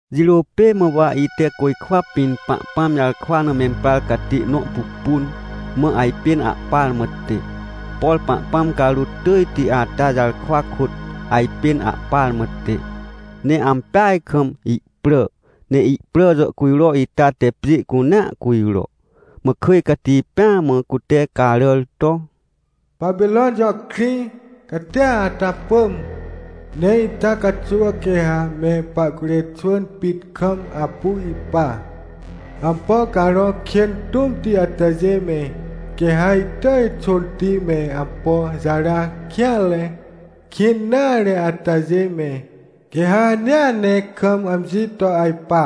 Jirô pê mã wa ite côjkwa pĩn Pahpãm jarkwa na memprar catê nõ pupun, mã ajpên ahpar mã tẽ. Por Pahpãm carôt tỳjti ata jarkwa kôt, ajpên ahpar mã tẽ. Ne ampeaj kam ihprà, ne ihprà jàhcujro ita te pjê cunea cujro. Mã kỳj cati pêa mã cute caràr to: — Papirõn jõ krĩ catia ata pỳm! Ne ita caxuw quê ha me pahcurê xwỳn pit kam apu ipa, ampo carõ kên tũmti atajê me. Quê ha ihtỳj xônti me, ampo jara kêanre, kĩn nare atajê me, quê ha hanea ne kam amji to ajpa.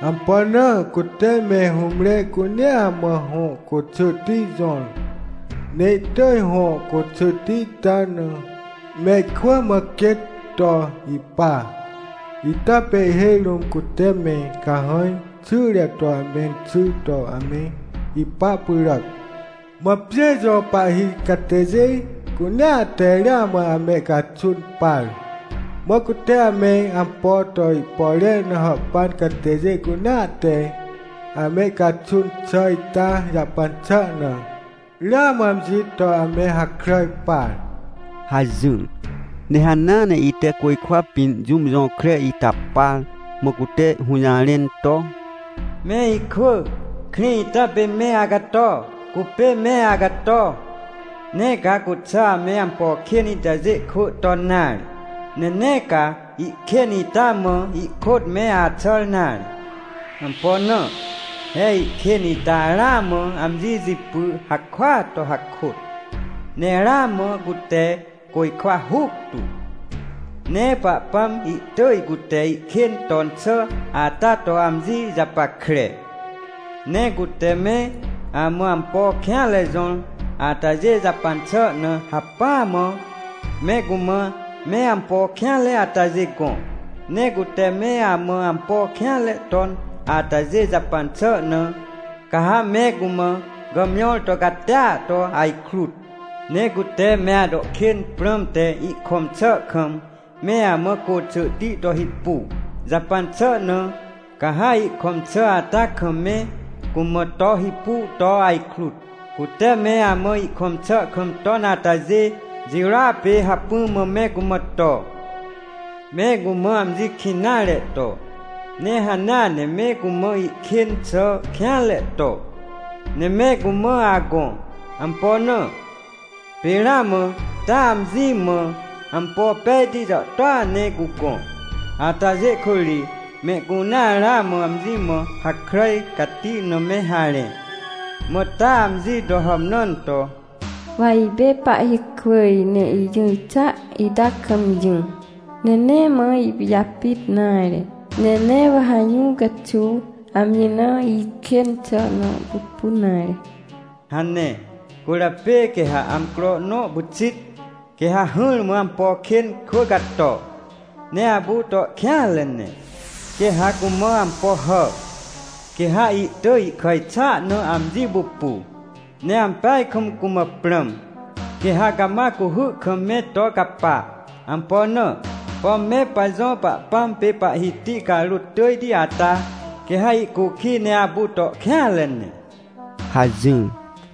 Ampo na? Cute me hũmre cunea mã hõ côxỳhti jõr, ne ihtỳj hõ côxỳhti ita na mehkwỳ mã quêt to ipa, ita pê ihhêj rũm cute me cahãj xyre to amenxy to ame ipa pyràac. Mã pjê jõ pahhi catêjê cunea te ramã amehcaxun par, mã cute ame ampo to ihpore na hàhpan catêjê cunea te amehcaxun xà ita jahpan xà na, ramã amji to ame hakràj par — hajỹr. Ne hanea ne ite côjkwa pĩn jũm jõkre ita par, mã cute hũjarẽn to: “Me ikwỳ, krĩ ita pê me acato, cupê me acato! Nee ca cuxà ame ampo kên itajê kwỳ ton nare. Ne nee ca ihkên ita mã ihkôt me axàr nare! Ampo na? He ihkên ita ramã amji jipy hakôat to hakôt, ne ramã cute côjkwa huctu. Ne Pahpãm ihtỳj cute ihkên ton xà ata to amji japackre. Ne cute me amã ampo kêanre jõr atajê jahpan xà na hacpỹa mã, me cumã me ampo kêanre atajêa gõ. Ne cute me amã ampo kêanre ton atajê jahpan xà na, ca ha me cumã gàmjõr to catia to ajkrut. Ne cute me ato kên prãmte ihkõm xà kam me amã côxỳhti to hipu jahpan xà na, ca ha ihkõm xà ata kam me cumã to hipu to ajkrut, cute me amã ihkõm xà kam ton atajê jirôa pê hacpỹ mã me cumã to. Me cumã amji kĩn nare to, ne hanea ne me cumã ihkên xà kêanre to, ne me cumã agõ. Ampo na? Pê ramã taa amji mã ampo pejti jàhtôa ne cugõ. Atajê kôt ri mehcunea ramã amji mã hakràj cati na me harẽ. Mã taa amji to hàmnãn to: “ ‘Wa ipê pahhikwỳj ne ijỹr xà ita kam jỹ! Ne nee mã ipijapit nare, ne nee wa ha jũ caxuw amji na ihkên xà nõ pupun nare’ hane. Cwỳrjapê quê ha amcro nõ pyxit, quê ha hỹrmã ampo kên kwỳ cato, ne apu to kêanre ne. Quê ha cumã ampo hà, quê ha ihtỳj ihkàj xà na amji pupu, ne ampeaj kam cumã prãm. Quê ha cama cuhy kam me to capa. Ampo na? Pom me pajõ Pahpãm pê Pahhiti carôt tỳjti ata quê ha ihcukij ne apu to kêanre ne” hajỹr.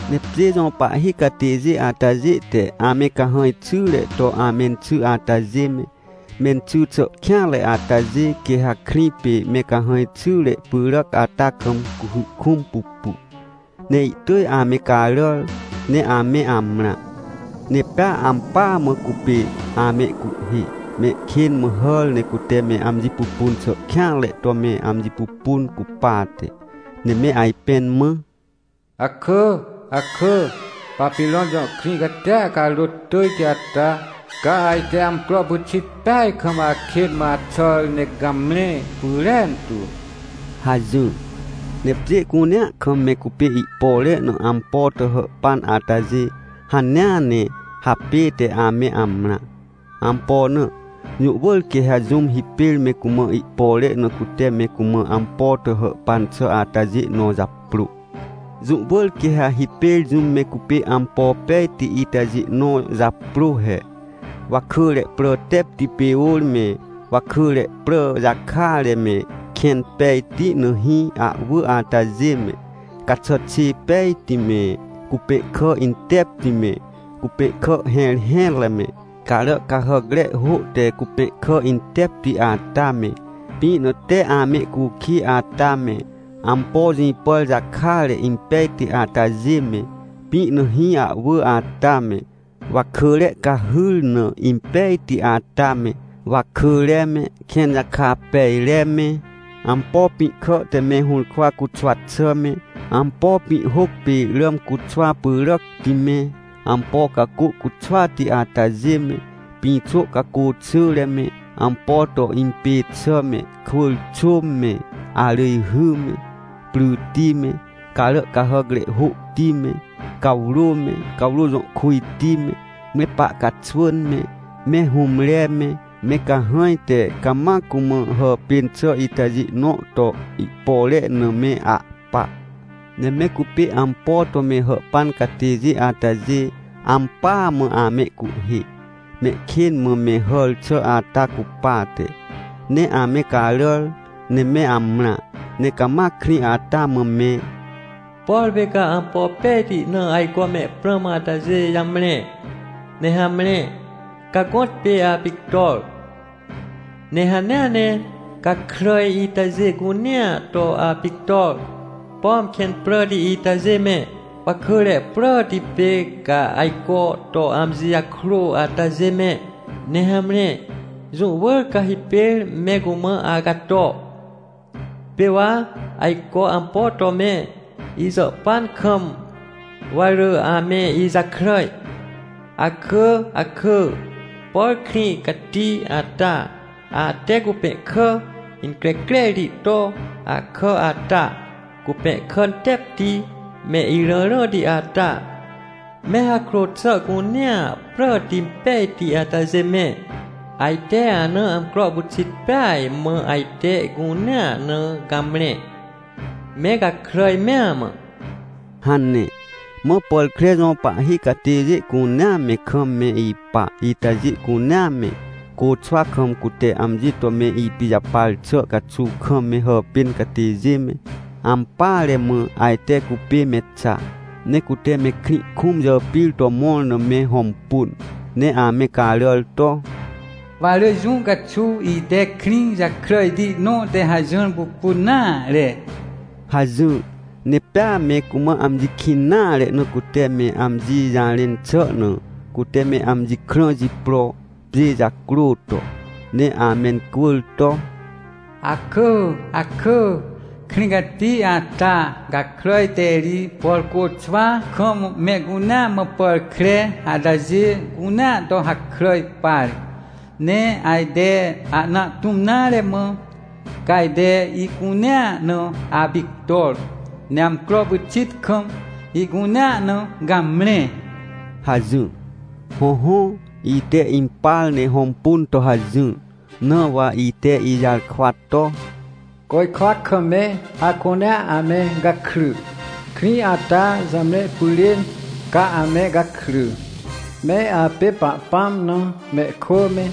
Ne pjê jõ pahhi catêjê atajê te ame cahãj xyre to amenxy atajê me, menxỳ xà kêanre atajê, quê ha krĩ pê me cahãj xyre pyràc ata kam cuhy kũm pupu, ne ihtỳj ame caràr ne ame amrã. Ne pea ampỳa mã cupê amehcuhhê, mehkên mã hàr ne cute me amji pupun xà kêanre to me amji pupun cupate, ne me ajpẽn mã: — Akỳ, akỳ, Papirõn jõ krĩ catia carôt tỳjti ata, ca ajte amcro pyxit peaj kam akên mã axàr ne gamre pyrentu — hajỹr. Ne pjê cunea kam me cupê ihpore na ampo to hàhpan atajê hanea ne hapête ame amrã. Ampo na? Jũ wỳr quê ha jũm hipêr me cumã ihpore na cute me cumã ampo to hàhpan xà atajê nõ japrô. Jũ wỳr quê ha hipêr jũm me cupê ampo pejti itajê nõ japrô he: Wakỳre prà tepti pê ôr me, wakỳre prà jakare me, kẽn pejti na hĩ ahwỳ atajê me, caxàt xê pejti me, cupẽhkà intepti me, cupẽhkà hẽrhẽtre me, carà cahàcre hô te cupẽhkà intepti ata me, pĩ na tee amehcukij ata me, ampo jĩpàr jakare impejti atajê me, pĩ na hĩ ahwỳ ata me, wakỳre cahhyr na impejti ata me, wakỳre me, kẽn jaka pejre me, ampo pĩ kà te me hũrkwa cuxwa xà me, ampo pĩhhôc pê ràm cuxwa pyràcti me, ampo cacô cuxwati atajê me, pĩxô cacô xỳre me, ampo to impê xà me, kwỳr xôm me, arỳjhy me, pryti me, carà cahàcre hôhti me, cawrô me, cawrô jõ kujti me, me pahcaxwỳn me, me hũmre me, me cahãj te cama cumã hàpên xà itajê nõ to ihpore na me ahpa. Ne me cupê ampo to me hàhpan catêjê atajê, ampỳa mã amehcuhhê, mehkên mã me hàr xà ata cupate, ne ame caràr ne me amrã, ne cama krĩ ata mã me: — Por pê ca ampo pejti na ajco mehprãm atajê jamre, ne hamre, ca gõtpê apictor! Ne hanea ne gakràj itajê cunea to apictor! Pom kẽn pràti itajê me, wakỳre pràti pê ca ajco to amji jakrô atajê me. Ne hamre, jũ wỳr ca hipêr me cumã acato. Pê wa ajco ampo to me ijàhpan kam, wa rỳ ame ijakràj. Akỳ, akỳ, por krĩ cati ata! Ate cupẽhkà increcrerti to akà ata, cupẽhkà tepti me irãrãti ata, me hakrô xà cunea pràti pejti atajê me. Ajte ana amcro pyxit peaj mã ajte ihcunea na gamre, me gakràj mea mã! — hane. Mã pàr kre jõ pahhi catêjê cunea me, kam me ipa itajê cunea me, côxwa kam cute amji to me ipijapar xà caxuw kam me hàpên catêjê me, ampỳare mã ajte cupê me xa. Ne cute mehkrĩ kũm jàpir to mõr na me hõmpun, ne ame caràr to: — Wa rỳ jũ caxuw ite krĩ jakràjti nõ te hajỹr pupun nare — hajỹr. Ne pea me cumã amji kĩn nare na cute me amji jarẽn xà na, cute me amji krã jipro, pjê jacrô to, ne amencwỳr to: — Akỳ, akỳ, krĩ cati ata! Gakràj te ri, por côxwa kam mehcunea mã pàr kre atajê cunea to hakràj par. Ne ajte ahna ahtũm nare mã ca ajte ihcunea na apictor, ne amcro pyxit kam ihcunea na gamre! — hajỹr. Hõhõ, ite impar ne hõmpun to hajỹr. Na wa ite ijarkwa to: — Côjkwa kam me acunea ame gakry! Krĩ ata jamre pyrên, ca ame gakry! Me apê Pahpãm na mehkwỳ me,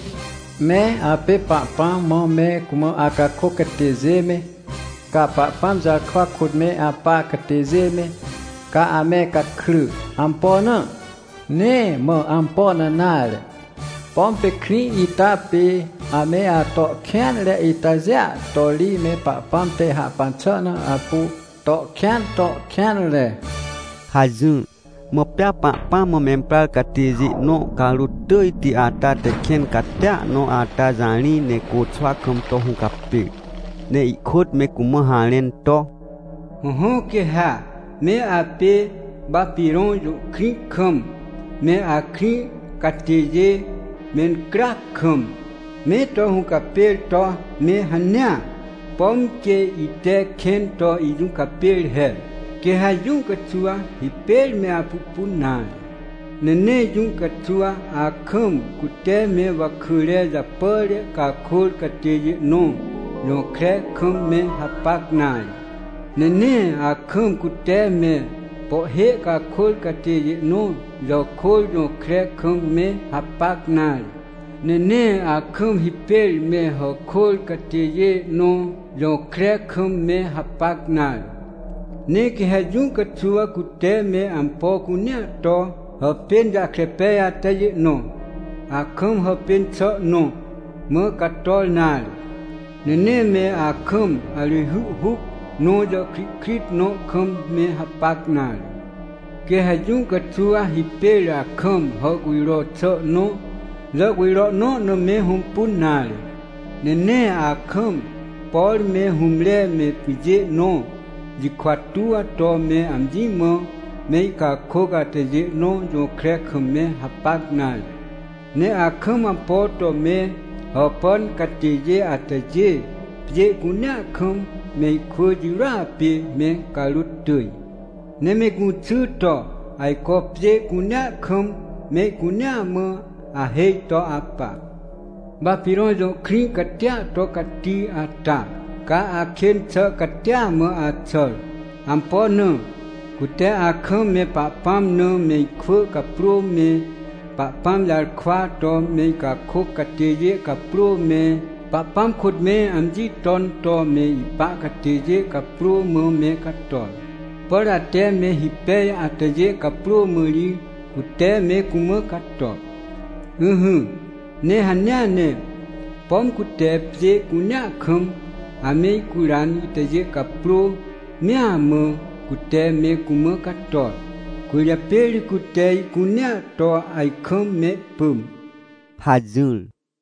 me apê Pahpãm mã me cumã acakôc catêjê me, ca Pahpãm jarkwa kôt me apa catêjê me, ca ame gakry! Ampo na? Nee mã ampo na nare, pom pê krĩ ita pê ame ato kêanre itajêa to ri me Pahpãm te hahpan xà na apu to kêan to kêanre — hajỹr. Mã pea Pahpãm mã memprar catêjê nõ, carôt tỳjti ata te kẽn catia nõ ata jarĩ ne côxwa kam to hũcapêr, ne ihkôt me cumã harẽn to: — Hõhõ, quê ha me apê Papirõn jõ krĩ kam me akrĩ catêjê mencryac kam me to hũcapêr to me hanea, pom quê ite kẽn to ijũcapêr he, quê ha jũ caxuw hipêr me apupun nare. Ne nee jũ caxuw akam, cute me wakỳre japàre cakôr catêjê nõ jõkre kam me hapac nare, ne nee akam, cute me pohhê cakôr catêjê nõ jàkôr jõkre kam me hapac nare, ne nee akam hipêr me hàkôr catêjê nõ jõkre kam me hapac nare. Ne quê ha jũ caxuw cute me ampo cunea to hàpên jahkre pej atajê nõ, akam hàpên xà nõ mã cator nare. Ne nee me akam arỳjhy huc nõ jàhkrihkrit nõ kam me hapac nare. Quê ha jũ caxuw hipêr akam hàhcujro xà nõ, jàhcujro nõ na me hõmpun nare. Ne nee akam, por me hũmre me pyjê nõ jikwa tuw to me amji mã mehcakôc atajê nõ jõkre kam me hapac nare. Ne akam ampo to me hàhpan catêjê atajê, pjê cunea kam mehkwỳ jirôa pê me carôt tỳj. Ne me gũxy to ajco pjê cunea kam mehcunea mã ahêj to apa. — Papirõn jõ krĩ catia to cati ata, caa ca akên xà catia mã axàr. Ampo na? Cute akam me Pahpãm na mehkwỳ caprô me, Pahpãm jarkwa to mehcakôc catêjê caprô me, Pahpãm kôt me amji ton to me ipa catêjê caprô mã me cator. Por ate me hipej atajê caprô mã ri, cute me cumã cator. Ỹhỹ, ne hanea ne, pom cute pjê cunea kam amehcuran itajê caprô mea mã cute me cumã cator, cwỳrjapê ri cute ihcunea to ajkam mehpỳm — hajỹr.